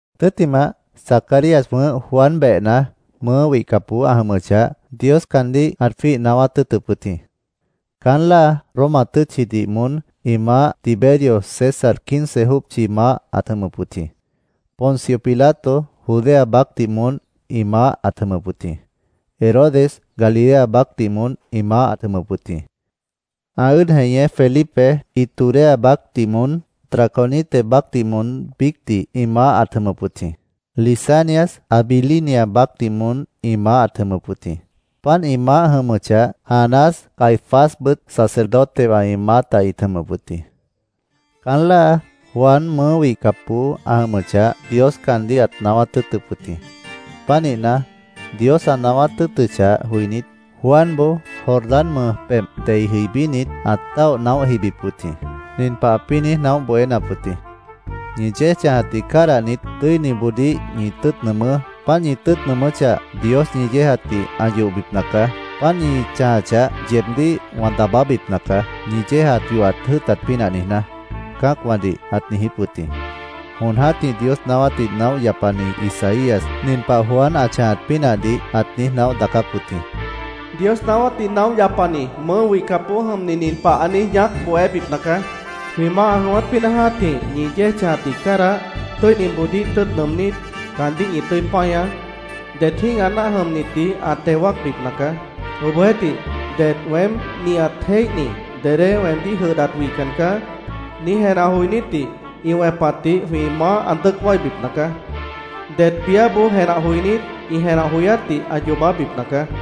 Tʉ́ttimah, Zacarías wʉ̃ʉ́h Juan behna, mʉʉ́ wihcapboó ã jʉmʉchah, Dios caandíh ãt jwíih naáwát tʉ́ʉtʉp wʉt jĩ. Caán láa Roma tʉ́tchidih moón ĩ maáh Tiberio César quince jópchi maáh ãt jʉmʉp wʉt jĩ. Poncio Pilato Judea baácdih moón ĩ maáh ãt jʉmʉp wʉt jĩ. Herodes Galilea baácdih moón ĩ maáh ãt jʉmʉp wʉt jĩ. Ã ʉ́ʉd jeñé Felipe Iturea baácdih moón, Traconite baácdih moón biícdih ĩ maáh ãt jʉmʉp wʉt jĩ. Lisanias Abilinia baácdih moón ĩ maáh ãt jʉmʉp wʉt jĩ. Páant ĩ maáh jʉmʉchah, Anás Caifásbʉt sacerdotewã ĩ maáta ĩt jʉmʉp wʉt jĩ. Caán láa, Juan mʉʉ́ wihcapboó ã jʉmʉchah, Dios caandíh ãt naáwát tʉ́ʉtʉp wʉt jĩ. Pánihna, Dios ã naáwát tʉ́ʉtʉchah joinít, Juanboó Jordán mʉj pebh dei jʉibínit, ãt táoh naóh jibip wʉt jĩ. Nin pah ãpĩ́ niíj naóh bohénap wʉt jĩ: “Ñi yéej chãjatdih cádahnit, tʉ́iniboodíh ñi tʉ́ʉt nʉʉmʉ́. Páant ñi tʉ́ʉt nʉʉmʉ́chah, Dios ñi yéejatdih ã yohbipna caá. Páant ñi chãjachah, yeebdíh wã daabábipna caá, ñi yéejat yohat jʉ́ʉtat pínah niijná”, cã́acwãdih ãt niijíp wʉt jĩ. Jon jã́tih Dios naáwátdih naóh yapani Isaías, nin pah Juan ã chãjat pínahdih ãt niíj naóh daacáp wʉt jĩ. “Dios naáwátdih naóh yapani mʉʉ́ wihcapboó jʉmni nin pah ã niíj ñaác bohébipna caá: ‘Jwĩ Maáh ã jʉ̃ʉ́wát pínah jã́tih ñi yéej chãjatdih cádah, tʉ́iniboodíh tʉ́ʉt nʉʉmnít, caandíh ñi tʉ́i páñaá. Det jĩ́gah náah jʉmnitdih ã teo wáacbipna caá. Obohjeéhtih, det “Weém nihat jéihni, dedé weemdíh jʉdhdat wihcan caá”, niíj jenah joinítdih ĩ wẽpatdih jwĩ Maáh ã dʉ́ʉc wáibipna caá. Det biáboó jenah joinít ĩ jenah joyátdih ã yoobábipna caá.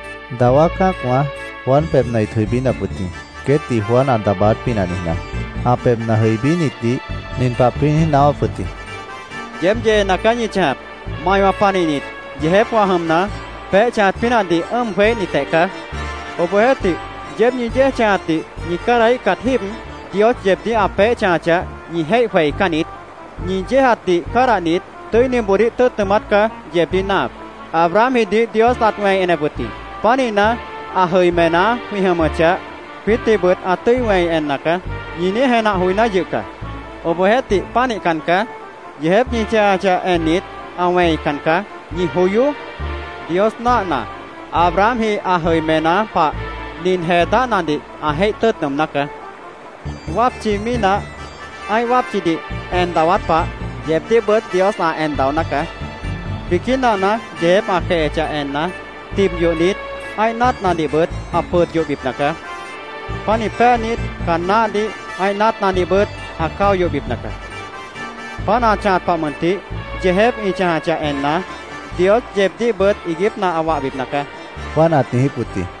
Dawá cã́acwã Juan pebhna ĩt jʉibínap wʉt jĩ, queétdih Juan ã daabáát pínah niijná. Ã pebhna jʉibínitdih nin pah ãpĩ́ niíj naáwáp wʉt jĩ: “¡Yeéb yeena caá ñi chãjap! ¡Maiwã panihnit yeejépwã jʉmna, peéh chãjat pínahdih ʉ́ʉm jweííhnitjeh caá! Obohjeéhtih, yeéb ñi yéej chãjatdih ñi cádahíhcat jíib, Dios yeebdíh ã peéh chãjachah, ñi jéih jweicán niít. Ñi yéejatdih cádahnit, tʉ́iniboodíh tʉ́ʉt nʉʉmát caá yeebdíh náahap. ‘Abrahamjidih Dios ãt wẽi enep wʉt jĩ. Pánihna, ã jʉimená jwĩ jʉmʉchah, jwiítdihbʉt ã tʉ́i wẽi enna caá’, ñi niíj jenah joiná yʉh caá. Obohjeéhtih, pánihcan caá. Yeejép ñi chãjachah ennit, ã wẽican caá. Ñi joyoó. Dios náahna, Abrahamji ã jʉimená pah nin jee dáhnadih ã jéih tʉ́ʉt nʉʉmná caá. Wápchi mínah ã́ih wápchidih en dawát pah, yeebdíhbʉt Dios ã en daoná caá. Biquí nahna yeejép ã quehechah enna, tib yohnit, ã́ih náatnadihbʉt ã pʉd yohbipna caá. Pánih péanit, caan náhdih, ã́ih náatnadihbʉt ã cáo yohbipna caá. Páant ã chãjat pah mʉntih, yeejép ñi chãjachah enna, Dios yeebdíhbʉt iiguípna ã wahbipna caá”, Juan ãt niijíp wʉt jĩ.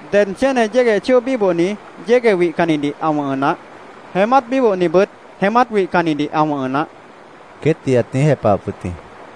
—Ded chéne yégueh chóo bíbohni yégueh wihcannidih ã wʉ̃hʉ naáh. Jeémát bíbohnibʉt jeémát wihcannidih ã wʉ̃hʉ naáh, queétdih ãt niíj jepahap wʉt jĩ.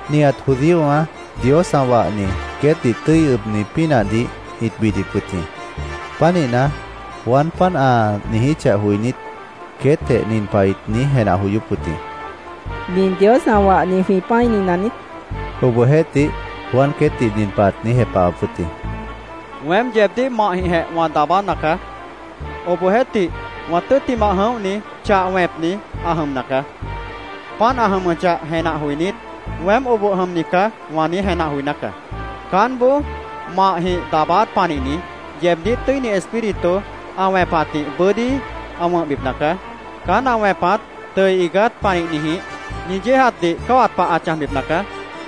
Nihat judíowã Dios ã wahni queétdih tʉ́i ʉbni pínahdih ĩt bidip wʉt jĩ. Pánihna, Juan páant ã niijíchah joinít, queétjeh nin pah ĩt niíj jenah joyóp wʉt jĩ: “¿Nin Dios ã wahni jwĩ pã́ini naniít?” ĩt niijíp wʉt jĩ. Obohjeéhtih, Juan queétdih nin pah ãt niijíp wʉt jĩ: “Weém yeebdíh mahjĩhjeh wã daabána caá. Obohjeéhtih, wã tʉ́ttimah jʉ̃óhni, chah wẽpni ã jʉmna caá. Páant ã jʉmʉchah jenah joinít, ‘Weém oboh jʉmni caá’, wã niíj jenah joiná caá. Caánboó mahjĩh daabáát panihni, yeebdíh Tʉ́ini Espíritu ã wẽpatdih bʉ́dí ã wʉ̃hbipna caá. Caán ã wẽpat tʉʉ iigát panihnijĩh ñi yéejatdih cáwat pah ã chãjbipna caá,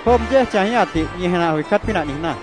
jwʉ́ʉb yéej chãjíhatdih ñi jenah joicát pínah niijná.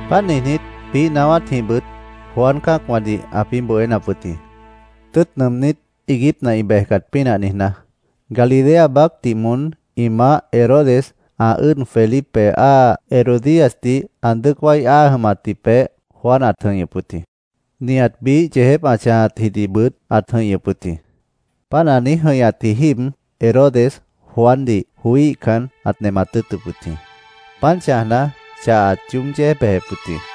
Páant niijnít, biíh naáwátjĩhbʉt Juan cã́acwãdih ãpĩ́ bohénap wʉt jĩ, tʉ́ʉt nʉʉmnít, iiguípna ĩ bejcat pínah niijná. Galilea baácdih moón ĩ maáh Herodes ã ʉ́ʉd Felipe áa Herodíasdih ã dʉ́ʉc wái áa jʉmatji peéh Juan ãt jʉ̃ihñʉp wʉt jĩ. Nihat biíh yeejép ã chãjatjidihbʉt ãt jʉ̃ihñʉp wʉt jĩ. Páant ã niíj jʉ̃ihñatji jíib Herodes Juandih joííhcan, ãt nemat tʉ́ʉtʉp wʉt jĩ. Pánih chãjna, chah ãt yoób yéej bejep wʉt jĩ.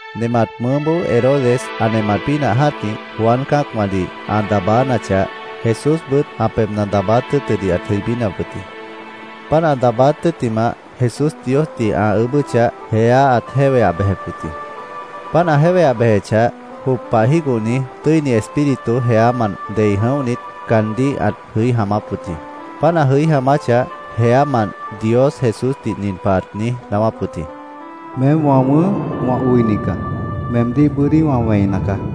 Nemat mʉʉ́boó Herodes ã nemat pínah jã́tih, Juan cã́acwãdih ã daabánachah, Jesúsbʉt ã pebhna daabáát tʉ́ʉtʉdih ãt jʉibínap wʉt jĩ. Páant ã daabáát tʉ́ttimah, Jesús Diosdih ã ʉʉ́bʉ́chah, jeá ãt jéweah bejep wʉt jĩ. Páant ã jéweah bejechah, jop pah jígohni Tʉ́ini Espíritu jeámant dei jʉ̃óhnit, caandíh ãt jʉí jaamáp wʉt jĩ. Páant ã jʉí jaamáchah, jeámant Dios Jesúsdih nin pah ãt niíj naáwáp wʉt jĩ: —Meém wã wʉ̃ʉ́h, wã oini caá. Meemdíh bʉ́dí wã wẽina caá, ãt niijíp wʉt jĩ.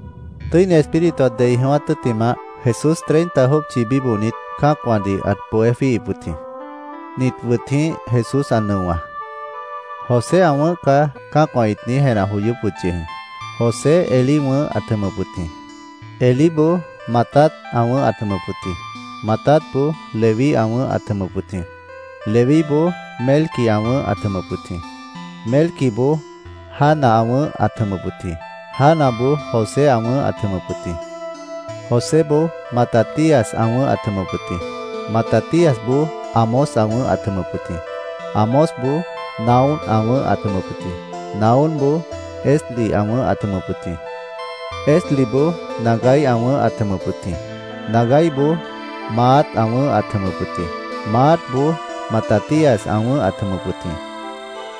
Tʉ́ini Espíritu ã dei jʉ̃ʉ́wát tʉ́ttimah, Jesús treinta jópchi bíbohnit, cã́acwãdih ãt bohé jwíihip wʉt jĩ. Nit wʉt jĩ Jesús ã nʉowã: “José ã wʉ̃ʉ́h caá”, cã́acwã ĩt niíj jenah joyóp wʉt yʉh jĩ. José Elí ã wʉ̃ʉ́h ãt jʉmʉp wʉt jĩ. Elíboó Matat ã wʉ̃ʉ́h ãt jʉmʉp wʉt jĩ. Matatboó Leví ã wʉ̃ʉ́h ãt jʉmʉp wʉt jĩ. Levíboó Melqui ã wʉ̃ʉ́h ãt jʉmʉp wʉt jĩ. Melquiboó Jana ã wʉ̃ʉ́h ãt jʉmʉp wʉt jĩ. Janaboó José ã wʉ̃ʉ́h ãt jʉmʉp wʉt jĩ. Joséboó Matatías ã wʉ̃ʉ́h ãt jʉmʉp wʉt jĩ. Matatíasboó Amós ã wʉ̃ʉ́h ãt jʉmʉp wʉt jĩ. Amósboó Nahúm ã wʉ̃ʉ́h ãt jʉmʉp wʉt jĩ. Nahúmboó Esli ã wʉ̃ʉ́h ãt jʉmʉp wʉt jĩ. Esliboó Nagai ã wʉ̃ʉ́h ãt jʉmʉp wʉt jĩ. Nagaiboó Maat ã wʉ̃ʉ́h ãt jʉmʉp wʉt jĩ. Maatboó Matatías ã wʉ̃ʉ́h ãt jʉmʉp wʉt jĩ.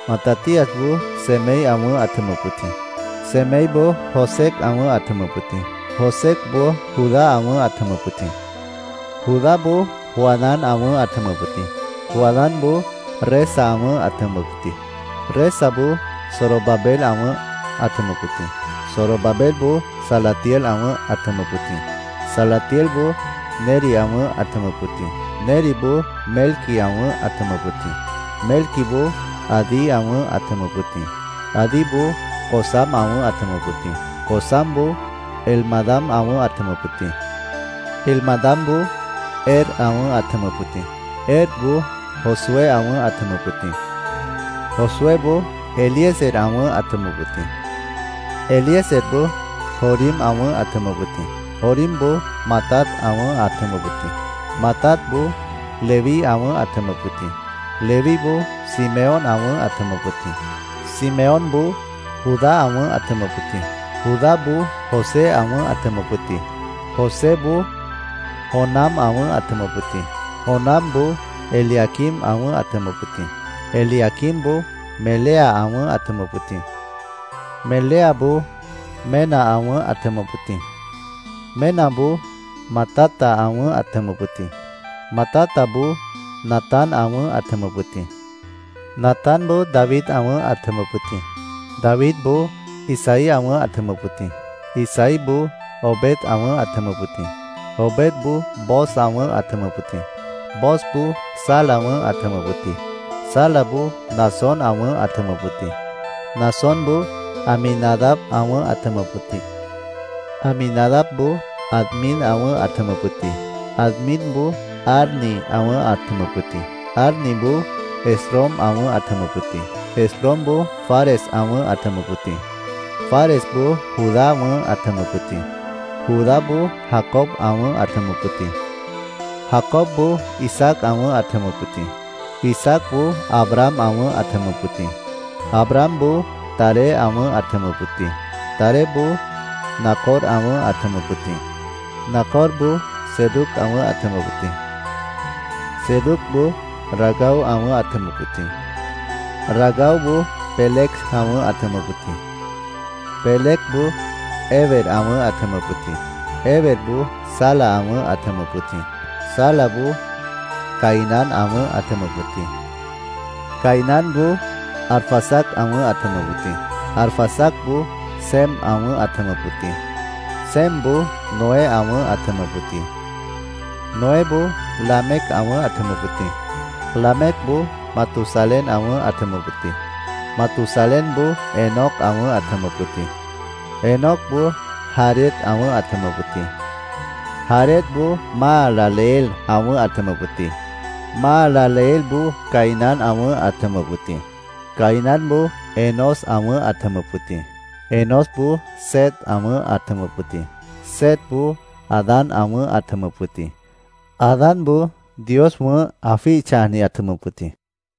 Matatíasboó Semei ã wʉ̃ʉ́h ãt jʉmʉp wʉt jĩ. Semeiboó Josec ã wʉ̃ʉ́h ãt jʉmʉp wʉt jĩ. Josecboó Judá ã wʉ̃ʉ́h ãt jʉmʉp wʉt jĩ. Judáboó Joanán ã wʉ̃ʉ́h ãt jʉmʉp wʉt jĩ. Joanánboó Resa ã wʉ̃ʉ́h ãt jʉmʉp wʉt jĩ. Resaboó Zorobabel ã wʉ̃ʉ́h ãt jʉmʉp wʉt jĩ. Zorobabelboó Salatiel ã wʉ̃ʉ́h ãt jʉmʉp wʉt jĩ. Salatielboó Neri ã wʉ̃ʉ́h ãt jʉmʉp wʉt jĩ. Neriboó Melqui ã wʉ̃ʉ́h ãt jʉmʉp wʉt jĩ. Melquiboó Adi ã wʉ̃ʉ́h ãt jʉmʉp wʉt jĩ. Adiboó Cosam ã wʉ̃ʉ́h ãt jʉmʉp wʉt jĩ. Cosamboó Elmadam ã wʉ̃ʉ́h ãt jʉmʉp wʉt jĩ. Elmadamboó Er ã wʉ̃ʉ́h ãt jʉmʉp wʉt jĩ. Erboó Josué ã wʉ̃ʉ́h ãt jʉmʉp wʉt jĩ. Josuéboó Eliezer ã wʉ̃ʉ́h ãt jʉmʉp wʉt jĩ. Eliezerboó Jorim ã wʉ̃ʉ́h ãt jʉmʉp wʉt jĩ. Jorimboó Matat ã wʉ̃ʉ́h ãt jʉmʉp wʉt jĩ. Matatboó Leví ã wʉ̃ʉ́h ãt jʉmʉp wʉt jĩ. Levíboó Simeón ã wʉ̃ʉ́h ãt jʉmʉp wʉt jĩ. Simeónboó Judá ã wʉ̃ʉ́h ãt jʉmʉp wʉt jĩ. Judáboó José ã wʉ̃ʉ́h ãt jʉmʉp wʉt jĩ. Joséboó Jonam ã wʉ̃ʉ́h ãt jʉmʉp wʉt jĩ. Jonamboó Eliaquim ã wʉ̃ʉ́h ãt jʉmʉp wʉt jĩ. Eliaquimboó Melea ã wʉ̃ʉ́h ãt jʉmʉp wʉt jĩ. Meleaboó Mena ã wʉ̃ʉ́h ãt jʉmʉp wʉt jĩ. Menaboó Matata ã wʉ̃ʉ́h ãt jʉmʉp wʉt jĩ. Matataboó Natán ã wʉ̃ʉ́h ãt jʉmʉp wʉt jĩ. Natánboó David ã wʉ̃ʉ́h ãt jʉmʉp wʉt jĩ. Davidboó Isaí ã wʉ̃ʉ́h ãt jʉmʉp wʉt jĩ. Isaíboó Obed ã wʉ̃ʉ́h ãt jʉmʉp wʉt jĩ. Obedboó Booz ã wʉ̃ʉ́h ãt jʉmʉp wʉt jĩ. Boozboó Sala ã wʉ̃ʉ́h ãt jʉmʉp wʉt jĩ. Salaboó Naasón ã wʉ̃ʉ́h ãt jʉmʉp wʉt jĩ. Naasónboó Aminadab ã wʉ̃ʉ́h ãt jʉmʉp wʉt jĩ. Aminadabboó Admin ã wʉ̃ʉ́h ãt jʉmʉp wʉt jĩ. Adminboó Arni ã wʉ̃ʉ́h ãt jʉmʉp wʉt jĩ. Arniboó Esrom ã wʉ̃ʉ́h ãt jʉmʉp wʉt jĩ. Esromboó Fares ã wʉ̃ʉ́h ãt jʉmʉp wʉt jĩ. Faresboó Judá ã wʉ̃ʉ́h ãt jʉmʉp wʉt jĩ. Judáboó Jacob ã wʉ̃ʉ́h ãt jʉmʉp wʉt jĩ. Jacobboó Isaac ã wʉ̃ʉ́h ãt jʉmʉp wʉt jĩ. Isaacboó Abraham ã wʉ̃ʉ́h ãt jʉmʉp wʉt jĩ. Abrahamboó Taré ã wʉ̃ʉ́h ãt jʉmʉp wʉt jĩ. Taréboó Nacor ã wʉ̃ʉ́h ãt jʉmʉp wʉt jĩ. Nacorboó Serug ã wʉ̃ʉ́h ãt jʉmʉp wʉt jĩ. Serugboó Ragau ã wʉ̃ʉ́h ãt jʉmʉp wʉt jĩ. Ragauboó Peleg ã wʉ̃ʉ́h ãt jʉmʉp wʉt jĩ. Pelegboó Heber ã wʉ̃ʉ́h ãt jʉmʉp wʉt jĩ. Heberboó Sala ã wʉ̃ʉ́h ãt jʉmʉp wʉt jĩ. Salaboó Cainán ã wʉ̃ʉ́h ãt jʉmʉp wʉt jĩ. Cainánboó Arfaxad ã wʉ̃ʉ́h ãt jʉmʉp wʉt jĩ. Arfaxadboó Sem ã wʉ̃ʉ́h ãt jʉmʉp wʉt jĩ. Semboó Noé ã wʉ̃ʉ́h ãt jʉmʉp wʉt jĩ. Noéboó Lamec ã wʉ̃ʉ́h ãt jʉmʉp wʉt jĩ. Lamecboó Matusalén ã wʉ̃ʉ́h ãt jʉmʉp wʉt jĩ. Matusalénboó Enoc ã wʉ̃ʉ́h ãt jʉmʉp wʉt jĩ. Enocboó Jared ã wʉ̃ʉ́h ãt jʉmʉp wʉt jĩ. Jaredboó Mahalaleel ã wʉ̃ʉ́h ãt jʉmʉp wʉt jĩ. Mahalaleelboó Cainán ã wʉ̃ʉ́h ãt jʉmʉp wʉt jĩ. Cainánboó Enós ã wʉ̃ʉ́h ãt jʉmʉp wʉt jĩ. Enósboó Set ã wʉ̃ʉ́h ãt jʉmʉp wʉt jĩ. Setboó Adán ã wʉ̃ʉ́h ãt jʉmʉp wʉt jĩ. Adánboó Dios wʉ̃ʉ́h, ã jwíih chãjniji, ãt jʉmʉp wʉt jĩ.